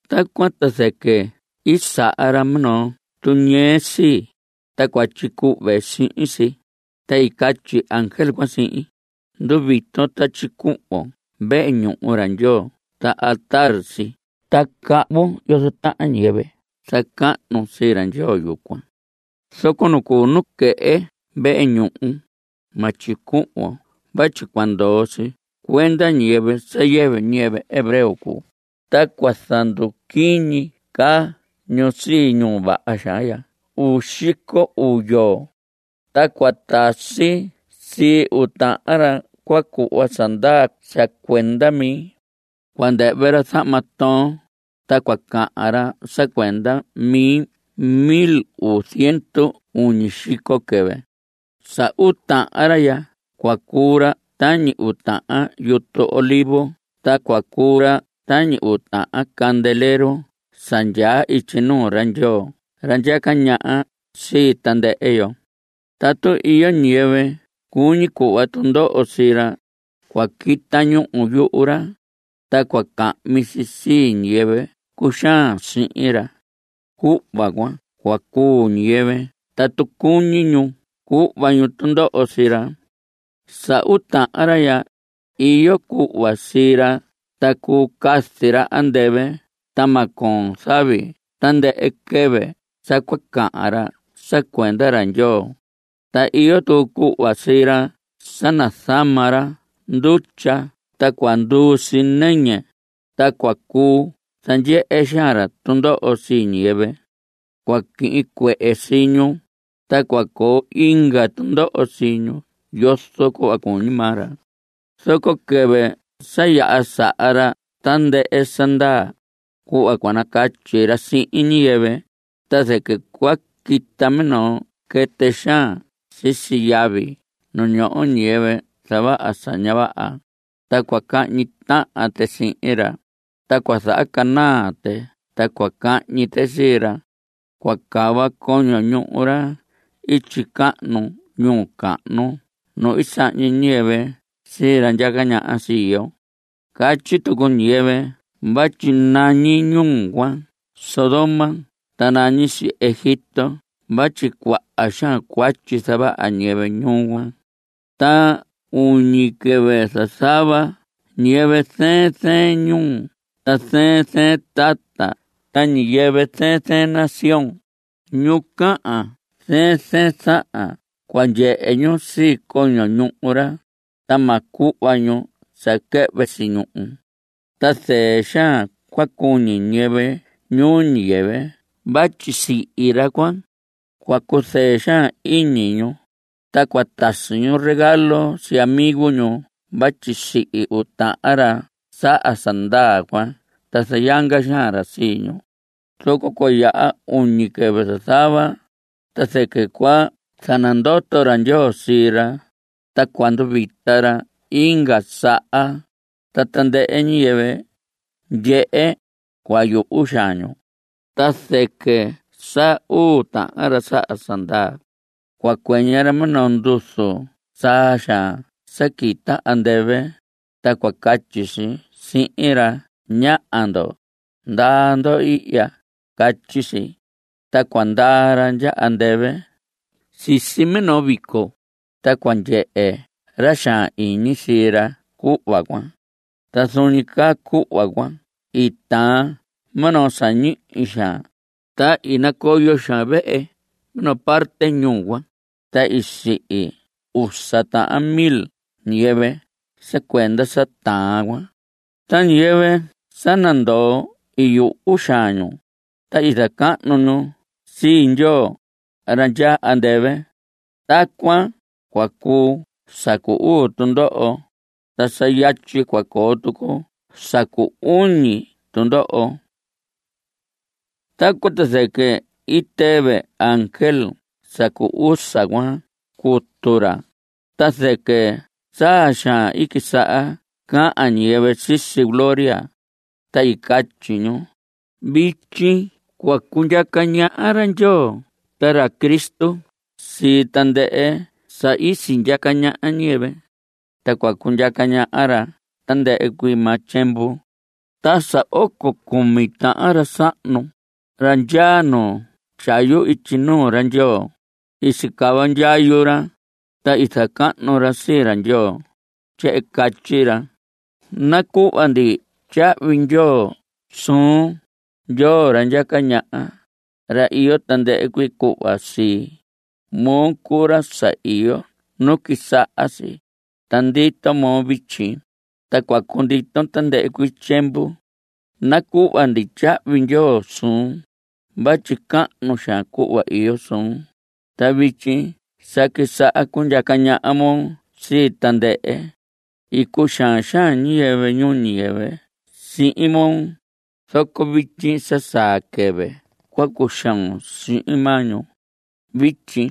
Tacuan ta zɨquɨ i saha ra minoo tuñɨɨ sii, ta cua tyicuhve sihin si, ta i catyi ángel cuan sihin: Nduviton ta tyicuhvon vehe ñuhu ra Ndyoo ta altar si ta cahvun yozo tahan ñiyɨvɨ zacahnu sii ra Ndyoo yucuan. Zoco nu cuu nuquehe vehe ñuhu, ma tyicuhvon vatyi cua ndoo si cuenda ñiyɨvɨ sa yɨvɨ ñiyɨvɨ hebreo cuu, ta cua zanduquiñi caa ñu sii ñuu vaha xaan ya uu xico uu yoo. Ta cua tasi sii uu tahan ra cua cuhva sa ndaa sa cuenda mi. Cua ndɨhvɨ ra zahma toon, ta cua cahan ra sa cuenda mi mil uu ziendu uñi xico quɨvɨ. Sa uu tahan ra ya cua cuu ra tañi uu tahan yutu olivos ta cua cuu ra tañi uu tahan candelero sa ndyaa ityi nuu ra Ndyoo ra ndyaca ñaha sii tandɨhɨ yo. Tatu iyo ñiyɨvɨ cuñi cuhva tundoho sii ra, cua quita ñúhu yuhu ra ta cua cahmi si sii ñiyɨvɨ cuxaan sii ra. Cuhva cuan cua cuu ñiyɨvɨ tatu cuñi ñu cuhva ñu tundoho sii ra. Sa uu tahan ra ya, iyo cuhva sii ra ta cuu cazi ra andɨvɨ ta ma coon zavi tandɨhɨ quɨvɨ sa cua cahan ra sa cuenda ra Ndyoo. Ta iyo tucu cuhva sii ra sa nazama ra ndutya ta cua nduu si nɨñɨ, ta cua cuu zandyehe xaan ra tundoho sii ñiyɨvɨ. Cua quihin cuehe sii ñu, ta cua coo inga tundoho sii ñu yozo cuhva cuñi maa ra. Zoco quɨvɨ sa yaha saha ra tandɨhɨ sa ndaa, cuhva cua nacatyi ra sihin ñiyɨvɨ, ta zɨquɨ cua quita minoo quɨtɨ xaan sisi yavi nu ñoho ñiyɨvɨ zavaha sa ña vaha, ta cua cahñi tahan tɨ sihin ra, ta cua zahacanaa tɨ ta cua cahñi tɨ sii ra. Cua cava coño ñuhu ra ityi cahnu ñuu cahnu nu i sahñi ñiyɨvɨ sii ra ndyaca ñaha sii yo. Catyi tucu ñiyɨvɨ vatyi nañi ñuu cuan Sodoma ta nañi si Egipto vatyi cuaha xaan cuatyi zavaha ñiyɨvɨ ñuu cuan. Ta uñi quɨvɨ zazava ñiyɨvɨ zɨɨn zɨɨn ñuu ta zɨɨn zɨɨn tata ta ñiyɨvɨ zɨɨn zɨɨn nación, ñu cahan zɨɨn zɨɨn zahan cua ndyehe ñu sii coño ñuhu ra, ta ma cuhva ñu sa quɨhvɨ si ñuhu. Ta zɨɨ xaan cua cuñi ñiyɨvɨ ñuu ñiyɨvɨ vatyi sihi ra cuan. Cua cuzɨɨ xaan iñi ñu, ta cua tasi ñu regalo sii amigo ñu vatyi sihi uu tahan ra saha sa ndaa cuan ta zayanga xaan ra sii ñu. Zoco cua yaha uñi quɨvɨ zazava, ta zɨquɨ cua zanandoto ra Ndyoo sii ra, ta cua nduvita ra inga saha. Ta tandɨhɨ ñiyɨvɨ ndyehe, cua yuhu xaan ñu. Ta zɨquɨ sa uu tahan ra saha sa ndaa, cua cuɨñɨ ra minoo nduzu saa xaan sa quita andɨvɨ, ta cua catyi si sihin ra: Ñaha ndo. Ndaa ndo ihya. Catyi si. Ta cua ndaa ra ndya andɨvɨ sisi minoo vico, ta cua ndyehe ra xaan iñi sii ra cuhva cuan. Ta zuun ñi caa cuhva cuan i taan minoo sa ñihi xaan, ta i nacoyo xaan vehe minoo parte ñuu cuan, ta i sihi usa tahan mil ñiyɨvɨ sa cuenda sa taan cuan. Ta ñiyɨvɨ sa nandoo i yuhu xaan ñu, ta i zacahnu ñu sii Ndyoo ra ndyaa andɨvɨ. Tacuan cua cuu sa cu uu tundoho, ta sa yatyi cua coo tucu sa cu uñi tundoho. Tacuan ta zɨquɨ i tɨvɨ ángel sa cu usa cuan cutu ra, ta zɨquɨ saa xaan i quisaha cahan ñiyɨvɨ sisi gloria, ta i catyi ñu: Vityi cua cundyaca ñaha ra Ndyoo ta ra Cristo sii tandɨhɨ sa i sindyaca ñaha ñiyɨvɨ. Ta cua cundyaca ñaha ra tandɨhɨ cuii maa tyiemvu. Ta sa oco cumi tahan ra sahnu, ra ndyaa nu tyayu ityi nuu ra Ndyoo, i sicava ndyayu ra, ta i zacahnu ra sii ra Ndyoo. Tyehen i catyi ra: Nacuhva ndi tyahvi ndyoo suun, Ndyoo ra ndyaca ñaha, ra iyo tandɨhɨ cuii cuhva sii. Moo cuu ra sa iyo nu quisaha si, ta ndito moo vityi, Ta cua cunditon tandɨhɨ cuii tyiemvu. Nacuhva ndi tyahvi ndyoo suun vatyi cahnu xaan cuhva iyo suun, Ta vityi sa quisaha cundyaca ñaha moo sii tandɨhɨ. I cuxaan xaan ñiyɨvɨ ñuu ñiyɨvɨ sihin moo, zoco vityi sa saa quɨvɨ cua cuxoon sihin maa ñu. Vityi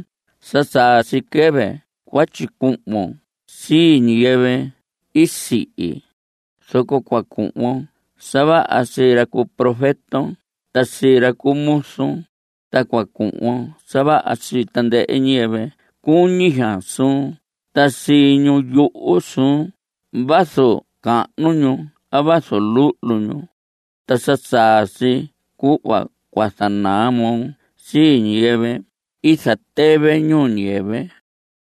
sa saa si quɨvɨ cua tyicuhvon sii ñiyɨvɨ i sihi, Zoco cua cuhvon sa vaha sii ra cu profeton ta sii ra cu muzun, Ta cua cuhvon sa vaha sii tandɨhɨ ñiyɨvɨ cuñi xaan suun ta sii ñu yuhu suun vazu cahnu ñu a vazu luhlu ñu. Ta sa saa si cuhva cua zanaa moo sii ñiyɨvɨ i zatɨvɨ ñuu ñiyɨvɨ.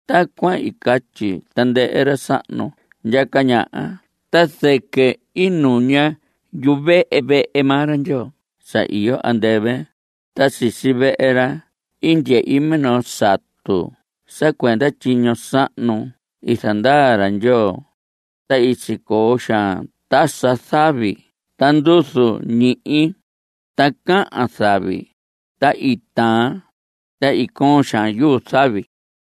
Tacuan i catyi tandɨhɨ ra sahnu ndyaca ñaha ta zɨquɨ i nuña yuvehe vehe maa ra Ndyoo sa iyo andɨvɨ, ta sisi vehe ra i ndyehi minoo satu sa cuenda tyiño sahnu i zandaa ra Ndyoo. Ta i sicoo xaan tasa zavi ta nduzu ñihi, ta cahan zavi. Ta i taan, ta i coon xaan yuu zavi.